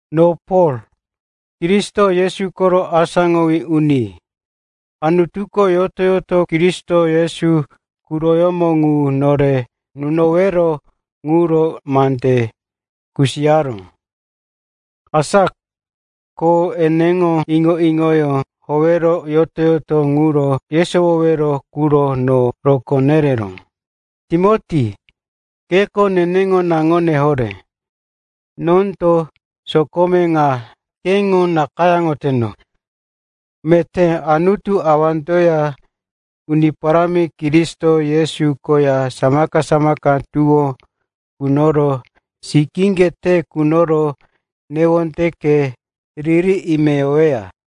No Pol, Kristo Yesu koro asáŋowí uni. Anutuko yoto-yoto Kristo Yesu quroko ŋu nore nunowero ŋuro mande kusiyaró. Asa ko eneŋo iŋo-iŋoyó howero yoto-yoto ŋuro yesowowero quro no rokó nereró. Timoti, keko neneŋo naŋone horé, nondo sokome ŋa keŋo nakayáŋoteno. Meté Anutu Awandoya Uni Paráminani Kristo Yesu koya samaka-samaka tuwó kunoro, sikíŋge te kunoro newondeke riri ime yoweya.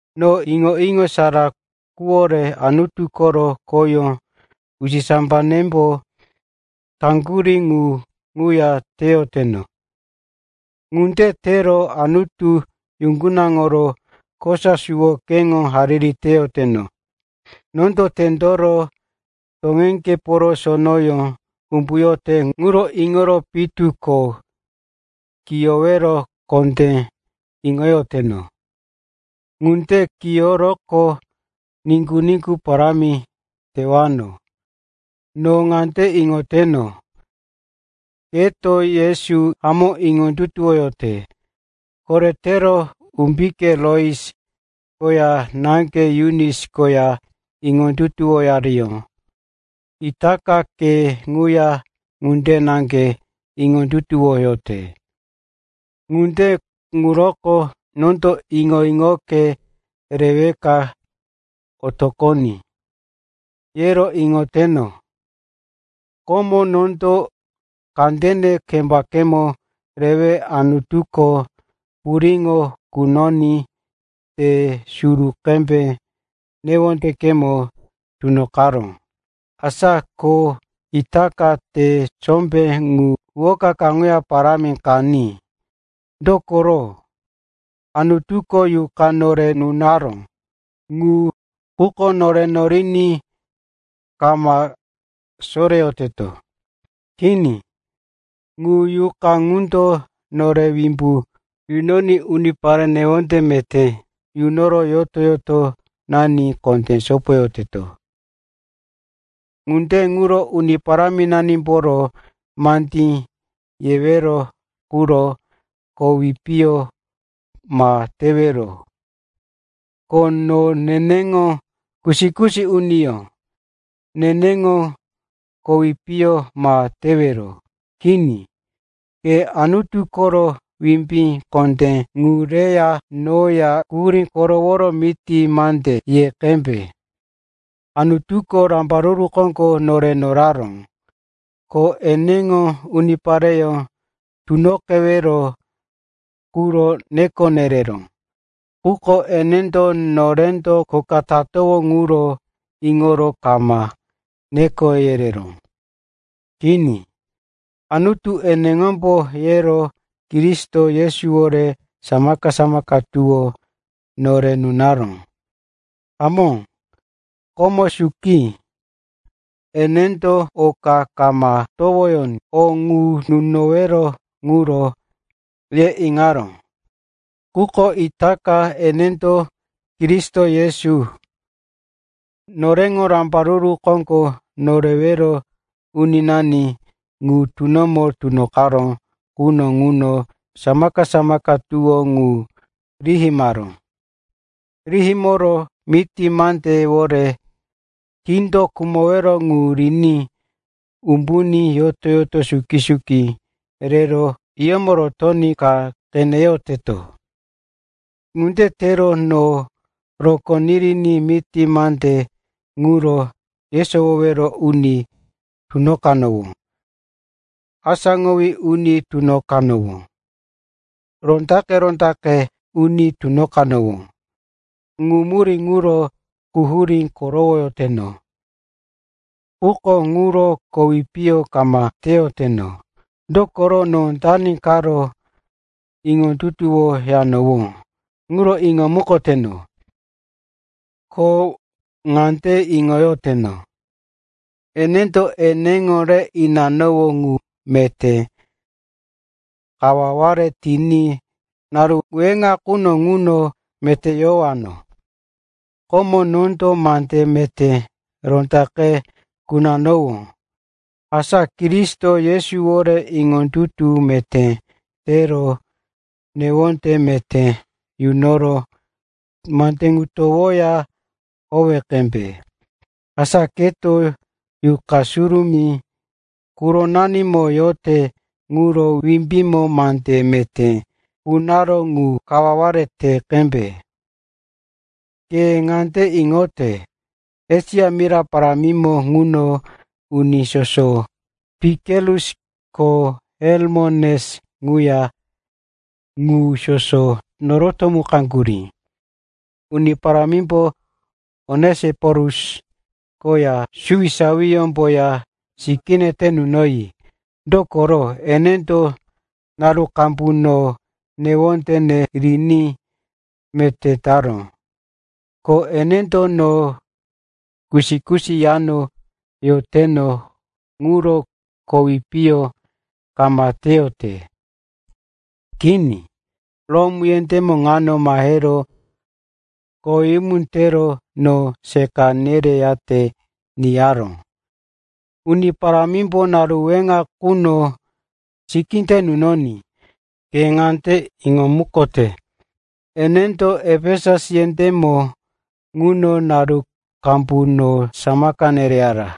No iŋo-iŋo sara quwore Anutu koro khoyó usisambanembo taŋgurí ŋu ŋuya teyoteno. Ŋunde tero Anutu yuŋgunaŋoro kosa suwo keŋo hariri teyoteno. Nondo tendoro toŋeŋgeporo sonoyó umbuyote ŋuro iŋoro pitu ko kiyowero kondé iŋoyoteno. Ŋunde kiyoroqo, niŋgu-niŋgu parámi tewano. No ŋande iŋoteno, keto Yesu hamó iŋondutuwoyote. Koretero umbike Lois koya náŋge Yunis koya iŋondutuwoyariyó, itaka ke ŋuya ŋunde naŋge iŋondutuwoyote. Ŋunde ŋuroko nondo, iŋo-iŋoke reweka otoqoní, yero iŋoteno. Komo nondo kandene kembakemo rewe Anutuko puriŋo kunoní te sombé qembe newondekemo tunoqaró. Asa ko itaka te sombé ŋu huwoka kaŋuya parámi qaní. Dokoro, Anutuko Yuqa nore nunaró ŋuko nore noriní kama soreyoteto. Kini, ŋu Yuqa ŋundo nore wimbu nunoní unipare newonde meté yunoro yoto-yotonani kondé sopoyoteto. Ŋunde ŋuro Uni Paráminanimboro mandí yewero quro kowi piyo ma tewero, ko no eneŋo kusi-kusi uniyó, neneŋo kowi piyo ma tewero. Kini, ke Anutu koro wimbí kondé ŋu reya noya quhurí koroworo miti mande ye qembe. Anutuko rambaruru koŋgo nore noraró, ko eneŋo unipareyó tunoqewero quro neko nereró. Quko enendo norendo kho ka tatowó ŋuro iŋoro kama neko yereró, kini. Anutu eneŋombo yero Kristo Yesuwore samaka-samaka tuwó nore nunaró. Hamó, komo suki, enendo oka kama towoyoní, o ŋu nunowero ŋuro, ye iŋaró. Quko itaka, enendo Kristo Yesu, noreŋo Rambaruru Koŋgo Norewero Uninani ŋu tunomo tunoqaró quno ŋuno samaka-samaka tuwó ŋu rihimaró. Rihimoro miti mandewore kindo khumowero ŋu riní umbuní yoto-yoto suki-suki rero hiyómo rotoní qeneyoteto. Ŋunde tero no rokó niriní miti mande ŋuro yesowowero uni tunoqanowó, asáŋowí uni tunoqanowó, rondaqe-rondaqe uni tunoqanowó. Ŋu murí ŋuro quhurí korowoyoteno. Quko ŋuro kowi piyo kama teyoteno. Dokoro no dani karo iŋondutuwoyanowó ŋuro iŋomukoteno. Ko ŋande iŋoyoteno, enendo neneŋo re inanowó ŋu meté kawaware tiní naru weŋa quno ŋuno meté yowano. Komo nondo mande meté rondaqe kunanowó. Asa Kristo Yesuwore iŋondutu meté tero newonde meté yunoro mande ŋu towoya howe qembe. Asa keto Yuqa Surumí quronanimo yote ŋuro wimbímbo mande meté kunaró ŋu kawaware te qembe. Ke ŋande iŋote, Esia mira parámimo ŋuno uni soso, Pikelus ko Heromokenes ŋuya, ŋu soso no norotomukaŋgurí. Uni Parámimbo Onesiporus koya suwisawiyómboya sikíye te yunoní. Dokoro enendo naru qambu no newondene riní meté taró. Ko enendo no kusi-kusi yano yoteno ŋuro kowi piyo kama teyote. Kini, Rom yendémo ŋano mahero koweyumu tero no seqa nereyate niyaró. Uni Parámimbo naru weŋa quno sikí te inoní. Ke ŋande iŋomukote, enendo Efesus yendémo ŋuno naru qambu no samaka nereyara.